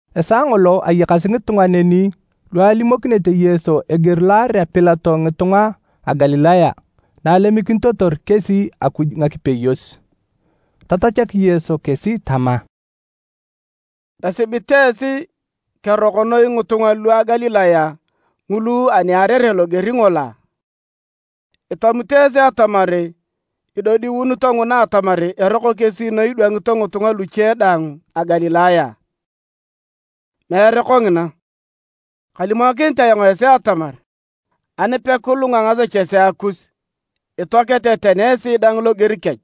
Esaa ngolo ayakasi ngitunga neni lu alimokinete Yesu eger lo aarea Pilato ngitunga a Galilaya na alemikinitotor kesi Akuj ngakipeyos. Tatachak Yesu kesi tama, “Esibit esi keroko noi ngitunga lua Galilaya ngulu ani aarere loger ngolo a? Itamito esi atamar idodiunito nguna atamar eroko kesi noi idwangito ngitunga luche daang a Galilaya a? Meere kongina! Kalimokinit ayong esi atamar ani pekilunga ngasechesea kus, itoakete tani esi daang loger kech.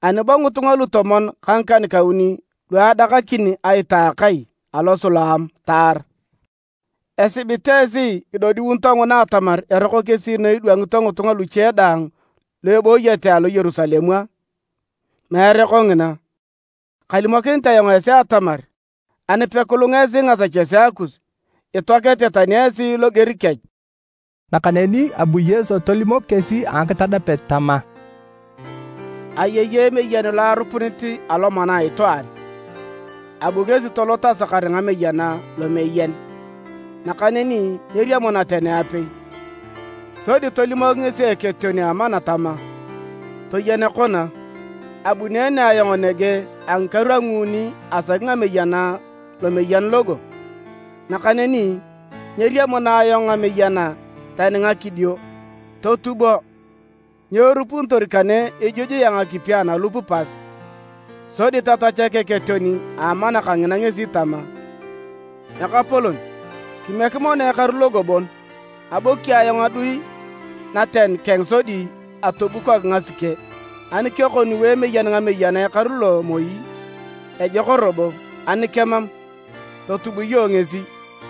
Ani bo ngitunga lutomon ka ngikan-kauni lu adakakin aita a akai alo Siloam taar? Esibit esi idodiunito nguna atamar eroko kesi noi idwangito ngitunga luche daang lu ibooyete alo Yerusalem a? Meere kongina! Kalimokinit ayong esi atamar ani pekilunga esi ngasechesea kus, itoakete tani esi loger kech.” Nakaneni abu Yesu tolimok kesi a ngakitadapet tama: “Ayei emeyen lo arupunit alomana a itwaan. Abu ngesi tolot asakar ngameyena lomeyen, nakaneni nyeriamuna tani apei. Sodi tolimok ngesi eketeon a amana tama, ‘Toyen kona, abuneene ayong nege a ngikaru a nguuni asaki ngameyena lomeyen logo, nakaneni nyeriamuna ayong ngameyena tani ngakidio. Totubo! Nyo erupunitor kane ijujuea ngakipi analup pas?’ Sodi tatachak eketeon a amana kangina ngesi tama, ‘Ekapolon, kimiek mono ekaru logo bon, aboki ayong adui naten keng sodi atobukok ngasike. Ani kekoniu emeyen ngameyena ekaru lo moi, ejok robo, ani kemam, totub iyong ngesi.’”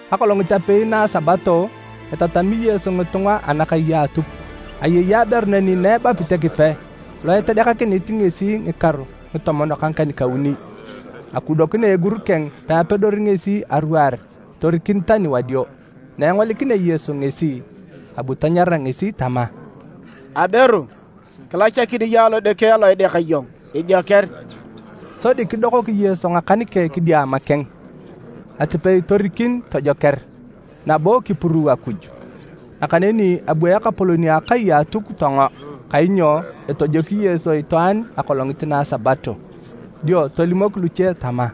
Akolongit apei na a Sabato etatami Yesu ngitunga anakai a Atuk. Ayei aberu neni na ebapit Ekipe lo etedeakakinit ngesi ngikaru ngitomon ka ngikan-kauni, akudokina egur keng peapedori ngesi aruar torikin tani wadio. Na engolikinea Yesu ngesi, abu tanyara ngesi tama, “Aberu, kilachakin iyong alodeke alo ideaka iyong, ijoker!” Sodi kidokok Yesu ngakan keng kidiama keng, atipei torikin tojoker, nabo kipuruu Akuj. Nakaneni abu ekapolon a akai a Atuk tongo, kainyo etojoki Yesu itwaan akolongit na a Sabato, dio tolimok luche tama,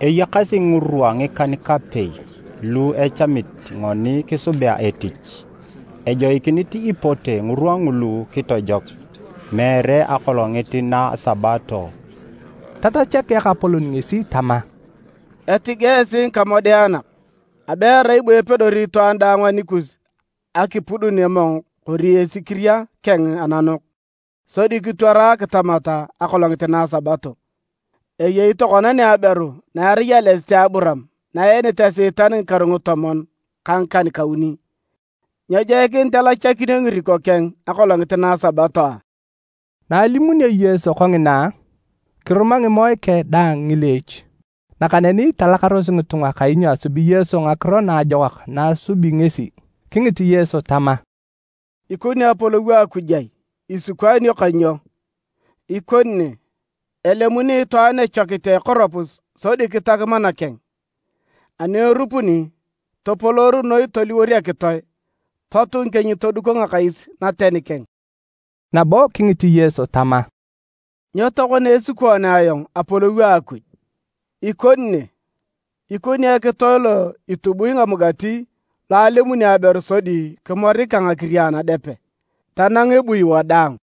“Eyakasi ngirwa ngikan-kapei lu echamit ngoni kisubea etich, ejoikinit ipote ngirwa ngulu kitojok, meere akolongit na a Sabato!” Tatachak Ekapolon ngesi tama, “Etige esi ngikamodeanak! Abe erai bo epedori itwaan daang anikus akipudun emong kori esikiria keng ananok, sodi kitwara akitamat akolongit na a Sabato. Eyei tokona ne aberu na erai ales a Aburaam na eenit Esiitan ngikaru ngitomon ka ngikan-kauni, nyejoikinit elachakinio ngiriko keng akolongit na a Sabato a?” Na alimunio Yesu kongina, kiruma ngimoe keng daang ngileech. Nakaneni talakaros ngitunga kainyo asubi Yesu ngakiro naajokak na asubi ngesi. Kingit Yesu tama, “Ikoni Apolou a Akuj ai? Isikwaanio ka nyo? Ikoni ne. Elemuni itwaan echokit a ekoropus sodi kitak mana keng, ani erupuni, topoloor noi toliwor ekitoe, pot ngikieny toduko ngakais naten keng.” Nabo kingit Yesu tama, “Nyo tokona esikwaanea ayong Apolou a Akuj? Ikoni ne. Ikoni ekitoe lo itubui ngamugati lo alemuni aberu sodi kimorik ka ngakiria anadepe, tanang ebui wadaang.”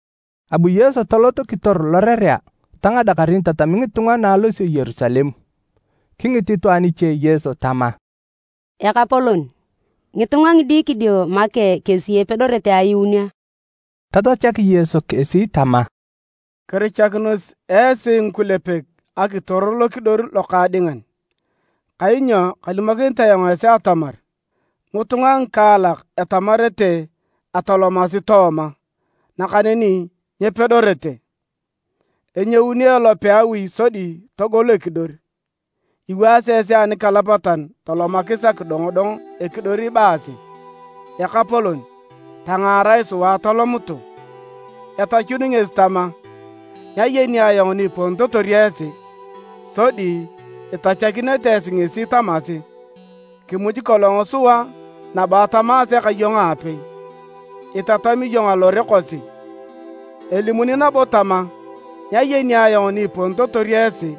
Abu Yesu tolot kitor lorerea ta ngadakarin itatami ngitunga na alosio Yerusalem. Kingit itwaan iche Yesu tama, “Ekapolon, ngitunga ngidikidio make kesi epedorete ayuun a?” Tatachak Yesu kesi tama, “Kirichakinos esi ngikulepek akitor lokidor lokaadingan, kainyo kalimokinit ayong esi atamar, ngitunga ngikaalak etamarete atolomasi tooma, nakaneni nyepedorete. Enyouni elope a awi sodi togol ekidor, iwaasi esi anikalapatan tolomakis akidongodong ekidor ibaasi, ‘Ekapolon, tangaarae sua atolomutu!’ Etachuni ngesi tama, ‘Nyayeni ayong ni iponitotor esi!’ Sodi itachakinete esi ngesi tamasi, ‘Kimuji kolong sua nabo atamaase ka iyong aapei, itatami iyong alore kosi.’ Elimuni nabo tama, ‘Nyayeni ayong ni iponitotor esi,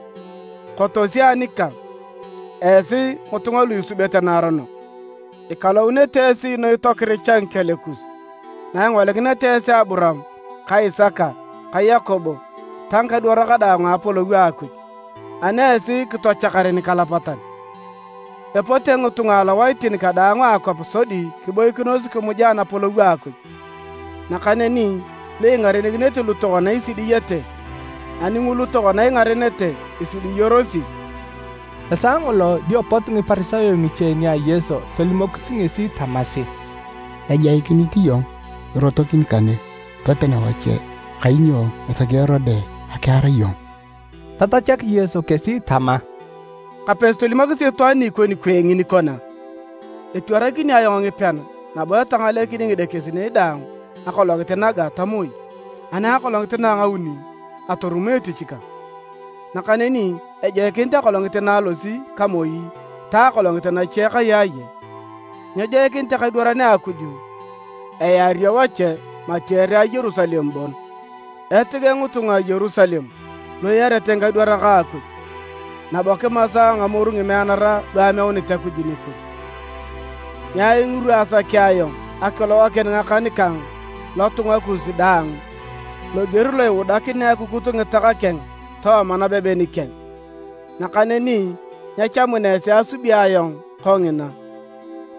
kotosi anikang, esi ngitunga lu isubete naaronok!’ Ikalounete esi noi tokiricha ngikel kus, naingolikineta esi Aburaam ka Isaka ka Yakobo ta ngikadwarak daang Anapolou a Akuj, ani esi kitochakar nikalapatan! Epote ngitunga alowaitin kadaang a akwap sodi kiboikinos kimuja Anapolou a Akuj. Nakaneni lu ingarenikinete lu tokona isidiyete, ani ngulu tokona ingarenete, isidiyorosi.” Esaa ngolo dio pot Ngiparisayo ngiche nia Yesu tolimokis ngesi tamasi, “Ejoikinit iyong torotok kane toten wache, kainyo esaki Erode akiar iyong.” Tatachak Yesu kesi tama, “Kapesi tolimokisi itwaan ni ikoni kwee ngini kona, ‘Etwaranakini ayong ngipean nabo etangalenokini ngidekesinei dang akolongit naga ta moi, ani akolongit na a ngauni atorumo etich kang.’ Nakaneni ejoikinit akolongit na alosi ka moi ta akolongit nache kayaaye, nyejoikinit ekadwaran a Akuj eario a wache mati ere a Yerusalem bon. “Etige ngitunga a Yerusalem lu iarete ngikadwarak a Akuj, nabo kimasa a ngamoru ngimeanara lu ameuni Akuj nikus! Ngiai ngirwa asakea ayong akilogakin ngakan kang lotunga kus daang loger lo iudakinea akukut ngitak keng tooma nabeben keng, nakaneni nyechamuna esi asubi ayong kongina!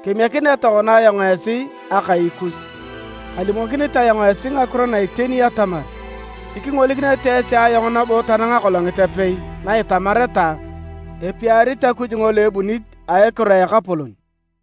Kemiekinea tokona ayong esi Akai kus. Kalimokinit ayong esi ngakiro na iteni atamar, nyikingolikinete esi ayong nabo tanang akolongit apei na itamareta, ‘Epiarit Akuj ngolo ebunit a ekiro a Ekapolon.’”